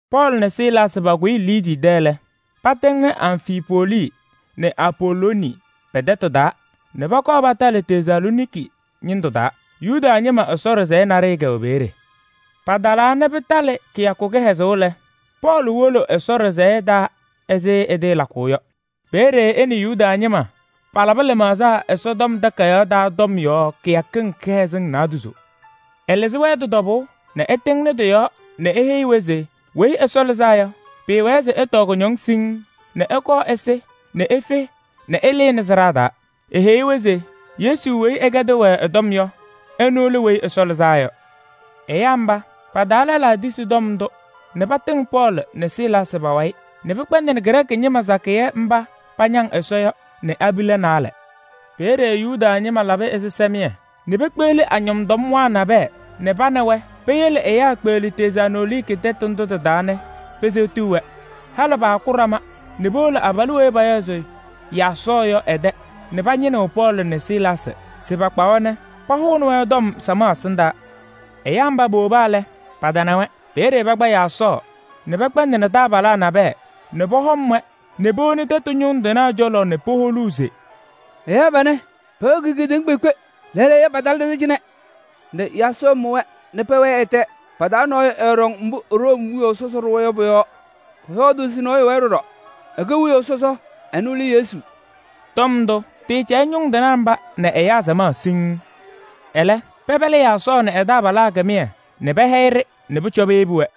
Pɔɔlɩ nɛ Silaasɩ pakʋyɩ Liidii tɛ lɛ, patɩŋnɩ Amfipolii nɛ Apolooni pɛ-tɛtʋ taa nɛ pɔkɔɔ patalɩ Tesalooniki ñɩndʋ taa, Yuda ñɩma Ɛsɔ ɖɩsɛyɛ naɖɩyɛ kɛwɛ peeye. Patalaa nɛ pɩtalɩ kɩyakʋ kɩhɛzʋʋ lɛ, Pɔɔlɩ wolo Ɛsɔ ɖɩsɛyɛ taa ɛzɩ ɛtɩɩlakʋʋ yɔ. Peeye ɛ nɛ Yuda ñɩma palabɩ lɩmaɣza Ɛsɔtɔm Takayaɣ taa tɔm yɔɔ kɩyakɩŋ kɩhɛzɩŋ naadozo. Ɛlɩzɩ-wɛ tɩ-tɔbʋʋ nɛ ɛtɩŋnɩ tɩ-yɔɔ nɛ eheyi-wɛ se Weyi Ɛsɔ Lɩzaa Yɔ, pɩɩwɛ mbʋ se ɛtɔɔ kʋñɔŋ siŋŋ nɛ ɛkɔɔ ɛsɩ nɛ efe nɛ ɛlɩnɩ sɩɖaa taa. Eheyi-wɛ se Yesu weyi ɛkɛdɩɣ-wɛ ɛ-tɔm yɔ, ɛnʋ lɛ Weyi Ɛsɔ Lɩzaa Yɔ. Ɛyaa mba, pa-taa lɛlaa tisi tɔm ndʋ nɛ patɩŋ Pɔɔlɩ nɛ Silaasɩ pa-wayɩ nɛ pɩkpɛndɩnɩ Grɛɛkɩ ñɩma sakɩyɛ mba pañaŋaɣ Ɛsɔ yɔ nɛ abila naayɛ. Peeye Yuda ñɩma labɩ ɛzɩsɛmɩyɛ nɛ pekpeɣli tɔɔyemwaa nabɛyɛ nɛ pa nɛ wɛ peyele ɛyaa kpeɣli Tesalooniki tɛtʋ ndʋ tɩ-taa nɛ peseɣti-wɛ. Halɩ paaku ɖama nɛ powolo abalʋ weyi payaɣ se Yaasɔɔ yɔ ɛ-tɛ nɛ pañɩnɩɣ Pɔɔlɩ nɛ Silaasɩ se pakpa-wɛ nɛ pahʋnɩ-wɛ samaɣ ɛsɩndaa. Ɛyaa mba powoba lɛ, patana-wɛ. Peeye pakpa Yaasɔɔ nɛ pɛkpɛndɩnɩ taabalaa nabɛyɛ nɛ pɔhɔm-wɛ nɛ powoni tɛtʋ ñʋŋ tɩnaa cɔlɔ nɛ poholuu se: “Ɛyaa panɛ, pɛwɛɛkɩɣ kedeŋa kpeekpe, lɛɛlɛɛyɔ, patalɩ ɖɛ-tɛ cɩnɛ nɛ Yaasɔɔ mʋ-wɛ nɛ pɛwɛɛ ɛ-tɛ! Pa-taa nɔɔyʋ ɛɛɖɔŋ mbʋ Room wiyaʋ sɔsɔ ɖʋwa yɔ pʋ-yɔɔ, pɔyɔɔdʋʋ se nɔɔyʋ wɛɛ ɖɔɖɔ, ɛkɛ wiyaʋ sɔsɔ, ɛnʋ lɛ Yesu.” Tɔm ndʋ, tɩɩcɛyɩ ñʋŋ tɩnaa mba nɛ ɛyaa samaɣ siŋŋ. Ɛlɛ pɛpɛlɩ Yaasɔɔ nɛ ɛ-taabalaa kɩmɩyɛ nɛ pɛhɛyɩ-ɖɩ nɛ pʋcɔ peyebi-wɛ.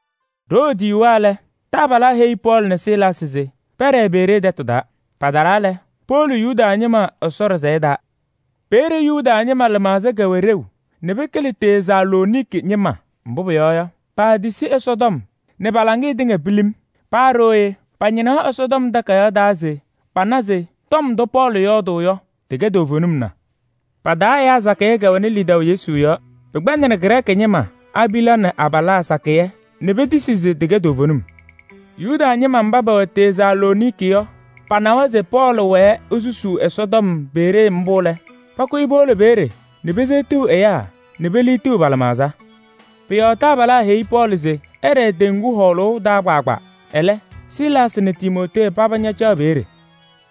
Ɖoo tɩyuwa lɛ, taabalaa heyi Pɔɔlɩ nɛ Silaasɩ se pɛɖɛɛ Beree tɛtʋ taa. Patalaa lɛ, powolo Yuda ñɩma Ɛsɔ ɖɩsɛyɛ taa. Peeye Yuda ñɩma lɩmaɣza kɛwɛ ɖeu nɛ pɩkɩlɩ Tesalooniki ñɩma, mbʋ pʋyɔɔ yɔ, paatisi Ɛsɔtɔm nɛ pa-laŋɩyɛ tɩŋa pilim. Paa ɖooye pañɩnaɣ Ɛsɔtɔm Takayaɣ taa se pana se tɔm ndʋ Pɔɔlɩ yɔɔdʋʋ yɔ, tɩkɛ toovenim na. Pa-taa ɛyaa sakɩyɛ kɛwɛnɩ lidaʋ Yesu yɔɔ, pɩkpɛndɩnɩ Grɛɛkɩ ñɩma: abila nɛ abalaa sakɩyɛ nɛ petisi se tɩkɛ toovenim. Yuda ñɩma mba pɛwɛ Tesalooniki yɔ, panɩwa se Pɔɔlɩ wɛɛ nɛ esusuu Ɛsɔtɔm Beree mbʋ lɛ, pakʋyɩ powolo peeye nɛ peseɣtiɣ ɛyaa nɛ peliɣtiɣ pa-lɩmaɣza. Pʋ-yɔɔ taabalaa tɩheyi Pɔɔlɩ se ɛɖɛɛ teŋgu hɔɔlʋʋ taa. Ɛlɛ, Silaasɩ nɛ Timootee paba ñacaɣ peeye.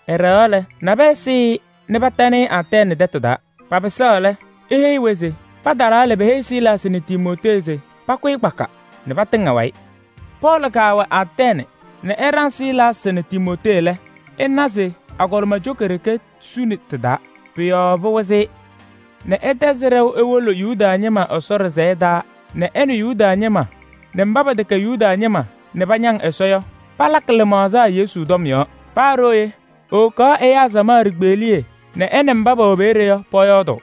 Ɛɖɛɣaɣ lɛ, nabɛyɛ sɩɩ-ɩ nɛ patanɩ-ɩ Atɛɛnɩ tɛtʋ taa. Papɩsaɣ lɛ, eheyi-wɛ se patalaa lɛ, peheyi Silaasɩ nɛ Timootee se pakʋyɩ kpaka nɛ patɩŋ ɛ-wayɩ. Pɔɔlɩ kaawɛ Atɛɛnɩ nɛ ɛɖaŋ Silaasɩ nɛ Timootee lɛ, ɛna se agɔlɩma coka ɖeke suni tɩ-taa. Pʋ-yɔɔ pɩwɩzɩ-ɩ nɛ ɛtɛzɩ ɖɛʋ ewolo Yuda ñɩma Ɛsɔ ɖɩsɛyɛ taa nɛ ɛ nɛ Yuda ñɩma nɛ mba pɛtɛkɛ Yuda ñɩma nɛ pañaŋ Ɛsɔ yɔ, palakɩ lɩmaɣza Yesu tɔm yɔɔ. Paa ɖooye, ewokaɣ ɛyaa samaɣ ɖikpeɣliye nɛ ɛ nɛ mba pɛwɛ peeye yɔ pɔyɔɔdʋʋ.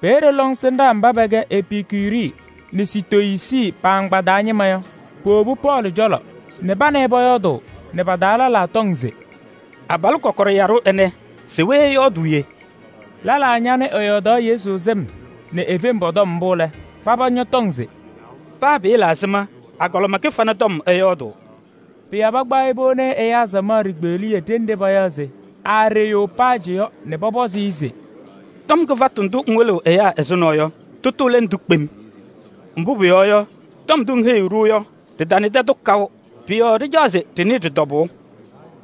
Peeye lɔŋsɩnɖaa mba pɛkɛ Epikuri nɛ Sitoyiisi pa-agbaa taa ñɩma yɔ, powobi Pɔɔlɩ cɔlɔ nɛ pa nɛ ɩ pɔyɔɔdʋʋ nɛ pa-taa lɛlaa tɔŋ se: “Abalʋ kɔkɔɖɛ yaɖʋ ɛnɛ, se we ɛyɔɔdʋʋ yee?” Lɛlaa ñanɩ ɛyɔɔdaɣ Yesu sɩm nɛ e-fem pɔ-tɔm mbʋ lɛ, paba ñɔtɔŋ se: “Paa pɩɩla ɛzɩma agɔlɩma kɩfana tɔm ɛyɔɔdʋʋ.” Pʋ-yɔɔ pakpaɣ-ɩ powoni ɛyaa samaɣ ɖikpeɣliye ɖenɖe payaɣ se Areyoopajɩ yɔ nɛ pɔpɔzɩ-ɩ se: “Tɔm kɩfatʋ ndʋ ŋwɩlɩɣ ɛyaa ɛzʋnɔ yɔ, tʋtʋ lɛ ndʋ kpem? Mbʋ pʋyɔɔ yɔ, tɔm ndʋ ŋheyiɣ-ɖʋ yɔ, ɖɩtanɩdɩ-tʋ kaʋ, pʋ-yɔɔ ɖɩcaɣ se ɖɩnɩɩ tɩ-tɔbʋʋ.”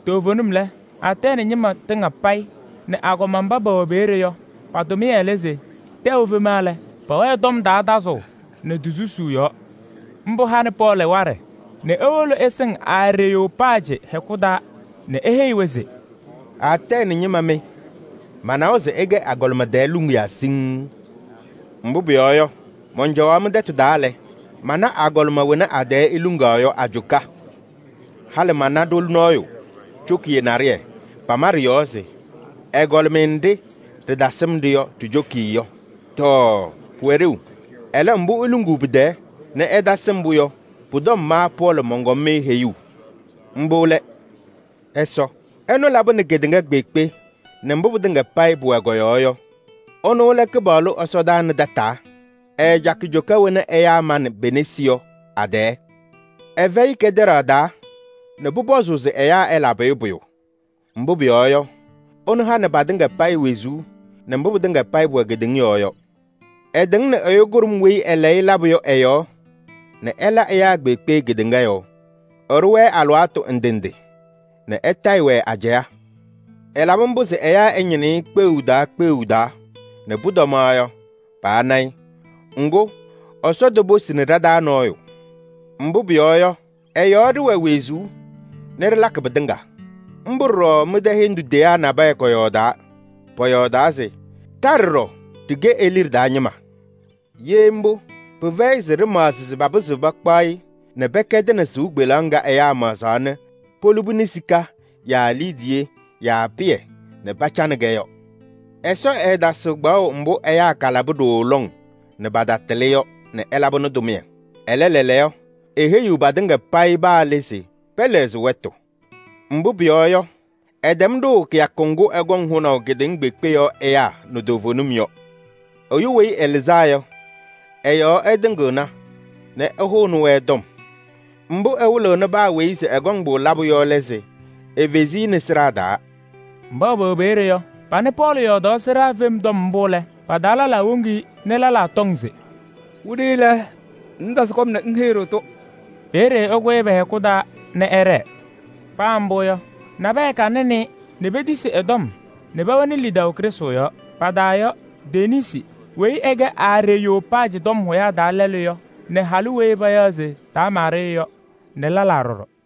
Toovenim lɛ, Atɛɛnɩ ñɩma tɩŋa payɩ nɛ agɔma mba pɛwɛ peeye yɔ, pa-tʋmɩyɛ lɛ se tɛʋ efema lɛ, pɛwɛɛ tɔm sɔŋʋʋ yɔɔ. Mbʋ hanɩ Pɔɔlɩ waɖɛ nɛ ewolo ɛsɩŋ Areyoopajɩ hɛkʋ taa nɛ eheyi-wɛ se: “Atɛɛnɩ ñɩma mɩ! Manawa se ɩkɛ agɔlɩma tɛɛ luŋiyaa siŋŋ. Mbʋ pʋyɔɔ yɔ, mɔncɔwaɣ mɩ-tɛtʋ taa lɛ, mana agɔlɩma wena a-tɛɛ iluŋaɣ yɔ a-coka. Halɩ mana ɖoli nɔɔyʋ cokiye naɖɩyɛ, pama ɖɩ-yɔɔ se: ‘Ɛgɔlɩmɩyɛ nɖɩ ɖɩtasɩm-ɖɩ yɔ ɖi-cokiye yɔ.’ Tɔɔ! Pʋwɛ ɖeu, mbʋ iluŋuu pɩ-tɛɛ nɛ ɩtasɩm-pʋ yɔ, pʋ-tɔm ma Pɔɔlɩ mɔnkɔm-mɩ heyuu: mbʋ lɛ Ɛsɔ. Ɛnʋ labɩnɩ kedeŋa kpeekpe nɛ mbʋ pɩtɩŋa pʋwɛ kɔ-yɔɔ yɔ, ɛnʋ lɛ Kɩpaɣlʋ ɛsɔdaa nɛ tataa. Ɛɛcakɩ coka wena ɛyaa manɩ pe-nesi yɔ a-tɛɛ. Ɛfɛyɩ kɛtɛɖaɣ taa nɛ pʋpɔzʋʋ se ɛyaa ɛlabɩ-ɩ pʋyʋ. Mbʋ pʋyɔɔ yɔ, ɛnʋ hanɩ patɩŋa payɩ wezuu nɛ mbʋ pɩtɩŋa pʋwɛ kedeŋa yɔɔ yɔ. Ɛtɩŋnɩ ɛyʋ kʋɖʋm weyi ɛlayɩ labʋ yɔ ɛ-yɔɔ nɛ ɛla ɛyaa kpeekpe kedeŋa yɔɔ. Ɛɖʋ-wɛ alɩwaatʋ ndɩ ndɩ nɛ ɛtayɩ-wɛ ajɛɛ. Ɛlabɩ mbʋ se ɛyaa ɛñɩnɩ-ɩ kpeɣu taa kpeɣu taa nɛ pʋtɔmaɣ yɔ, pana-ɩ. Ŋgʋ, Ɛsɔ toposini ɖa-taa nɔɔyʋ. Mbʋ pʋyɔɔ yɔ, ɛ-yɔɔ ɖɩwɛ wezuu nɛ ɖɩlakɩ pɩtɩŋa. Mbʋ ɖɔɖɔ mɩ-tɛ hendu teyaa nabɛyɛ kɔyɔɔdaa. Pɔyɔɔdaa se: ‘Ɖa ɖɔɖɔ ɖɩkɛ e-liɖe taa ñɩma.’ Ye mbʋ, pɩfɛyɩ se ɖɩmaɣzɩ se papɩzɩɣ pakpaɣ-ɩ nɛ pɛkɛdɩnɩ sɩʋ kpeleɣ ŋga ɛyaa maɣzaa nɛ polubini sika yaa liidiye yaa pɩyɛ nɛ pacanɩ-kɛ yɔ. Ɛsɔ ɛɛtasɩɣ kpaɣʋ mbʋ ɛyaa kalabɩ ɖooo lɔŋ nɛ patatɩlɩ yɔ nɛ ɛlabɩnɩ tʋmɩyɛ. Ɛlɛ, lɛɛlɛɛyɔ eheyiɣ patɩŋa payɩ paa le se pɛlɛɣzɩ wɛtʋ. Mbʋ pʋyɔɔ yɔ, ɛtɛm ɖʋʋ kɩyakʋ ŋgʋ ɛkɔŋ hʋnaʋ kedeŋa kpeekpe yɔɔ ɛyaa nɛ toovenim yɔ. Ɛyʋ weyi ɛlɩzaa yɔ, ɛ-yɔɔ ɛtɩŋɩɣna nɛ ɛhʋnɩ-wɛ. Mbʋ ɛwɩlɩnɩ paa weyi se ɛkɔŋ-pʋ labʋ yɔ lɛ se efezi-i nɛ sɩɖaa taa.” Mba pɛwɛ peeye yɔ, panɩ Pɔɔlɩ yɔɔdaɣ sɩɖaa fem tɔm mbʋ lɛ, pa-taa lɛlaa woŋ-i nɛ lɛlaa ñɔtɔŋ se: “Wiɖiyi lɛ, ŋŋtasɩ kɔm nɛ ŋheyi-ɖʋ-tʋ.” Peeye ɛkʋyɩ pɛ-hɛkʋ taa nɛ ɛɖɛɛ. Paa mbʋ yɔ, nabɛyɛ kanɩnɩ-ɩ nɛ petisi ɛ-tɔm nɛ pɛwɛnɩ lidaʋ Krɩstʋ yɔɔ. Pa-taa yɔ: Denisi weyi ɛkɛ Areyoopajɩ tɔm hʋyaa taa lɛlʋ yɔ nɛ halʋ weyi payaɣ se Damaari yɔ nɛ lɛlaa ɖɔɖɔ.